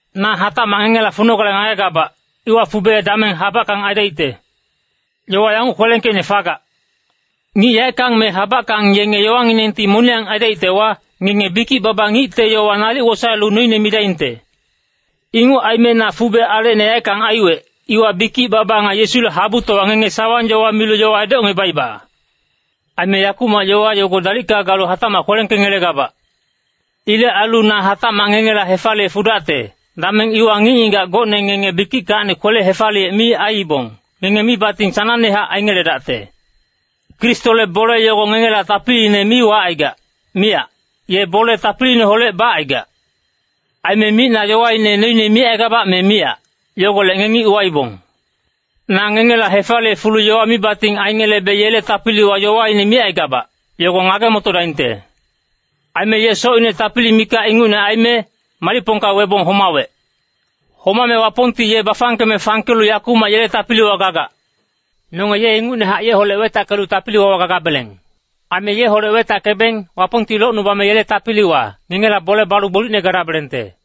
Na hatacmac ngengela funogale ngagegabac, iwa fube dameng habackang aidaicte. Yowa yanguc kwelengkeicne fagac, “Ngic yaeckang me habackang yenge yowanginengti moniyang aidaictewa, ngenge bikic-baba ngicte yowa nalic wosaelu noine midaingte.” Inguc aime na fube alecine yaeckang aiwec, iwa bikic-baba nga Yesule habutowa ngenge sawang-yowa milu yowa edocngebaiba. Aime yakumac yowa yogo dalicka galu hatacmac kwelengkengelegabac. Ilec ailu na hatacmac ngengela hefaliye fudacte, dameng iwa ngic-ngigac gocne ngenge bikickacni kwele-hefaliyec mi aiibong, ngenge mibating sanangnehac aingeledacte. Kristole bole yogo ngengela tapiliine mi wacaigac, miyac, ye bole tapiliineholec bacaigac. Aime micna yowaine noine micaigabac me miyac, yogolec ngengi uwaibong. Na ngengela hefaliye fulu yowa mibating aingelebe yele tapiliwa yowaine micaigabac, yogo ngage-motodaingte. Aime ye socine tapili mikac ingucne aime, malicpongka webong homawec. Homame Wapongti ye bafangkeme fangkelu yakumac yele tapiliwa gagac. Nonge ye ingucnehac yeholec wetackelu tapili-wawa gagabeleng. Aime yeholec wetackebeng, Wapongti locnubame yele tapiliwa, ngengela bole balu gbolicne gadabelengte.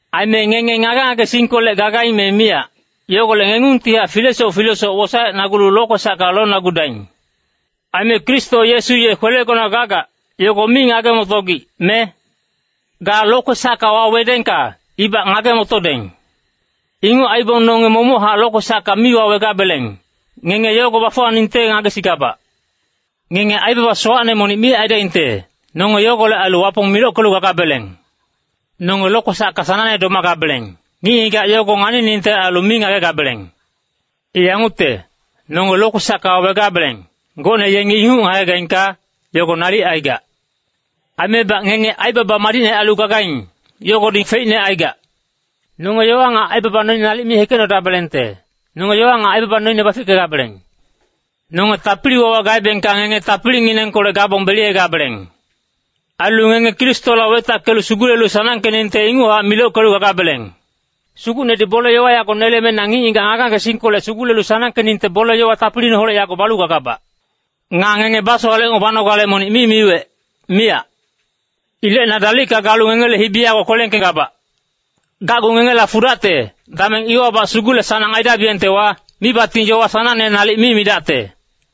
Aime ngenge ngage-ngagesingkolec gagaing me miyac, yogolec ngengungtihac filesoc filesoc wosaecnagulu lokwesacka lonagudaing. Aime Kristo Yesu ye kwelegona gagac, yogo mi ngage-motogic, me? Ga lokwesacka wawedengka, ibac ngage-motodeng. Inguc aibong nonge momochac lokwesacka mi wawegabeleng, ngenge yogo bafuwaningte ngagesigabac. Ngenge aibaba sowacne monic mi aidaingte. Nonge yogolec ailu Wapong milockelu gagabeleng. Nonge lokwesacka sanangne domagabeleng, ngic-ngigac yogo nganiningte ailu mi ngagegabeleng. I yangucte, nonge lokwesacka wawegabeleng, gocne yengi inguc ngagegaingka, yogo nalic aigac. Aimebac ngenge aibaba madicne ailu gagaing, yogodi feicne aigac. Nonge yowa nga aibaba noine nalic mi hekecnodabelengte, nonge yowa nga aibaba noine bafickegabeleng. Nonge tapili-wawa gaebengka ngenge tapilinginengkolec gabong beliyegabeleng. Ailu ngenge Kristoholec wetackelu sugulelu sanangkeningte inguchac milockelu gagabeleng. Sugucnedi bole-yowa yago neleme na ngic-ngigac ngage-ngagesingkolec sugulelu sanangkeningte bole-yowa tapiliineholec yago balu gagabac. Nga ngenge basowalecngebanogale monic mi miwec, miyac. Ilec na dalicka galu ngengele hibi yago kwelengkegabac. Gacgu ngengela fudacte, dameng iwabac sugule-sanang aidabiyengtewa, mibating yowa sanangne nalic mi midacte.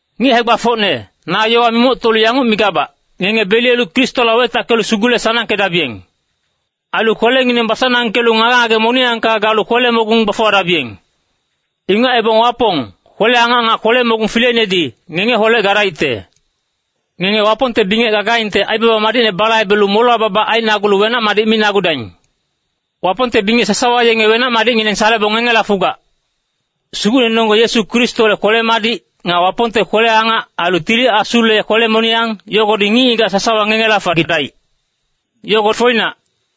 Ngic hae-gbafocne, na yowa mimoctolu yanguc migabac, ngenge beliyelu Kristoholec wetackelu sugule-sanangkedabiyeng. Ailu kwelengineng basanangkelu ngage-ngage moniyangka galu kwele-mogung bafuwadabiyeng. Inguc aibong Wapong, kwele-angac nga kwele-mogung fileinedi, ngengeholec gadaicte. Ngenge Wapongte bingec gagaingte aibaba madicne balaibelu molewa babac ainagulu wenac-madic minagudaing. Wapongte bingec sasawa yenge wenac-madicngineng salebong ngengela fugac. Sugucnenonggeng Yesu Kristole kwele-madic, nga Wapongte kwele-angac, ailu Tili Asule kwele-moniyang, yogodi ngic-ngigac sasawa ngengela fagidaic. Yogo foinac.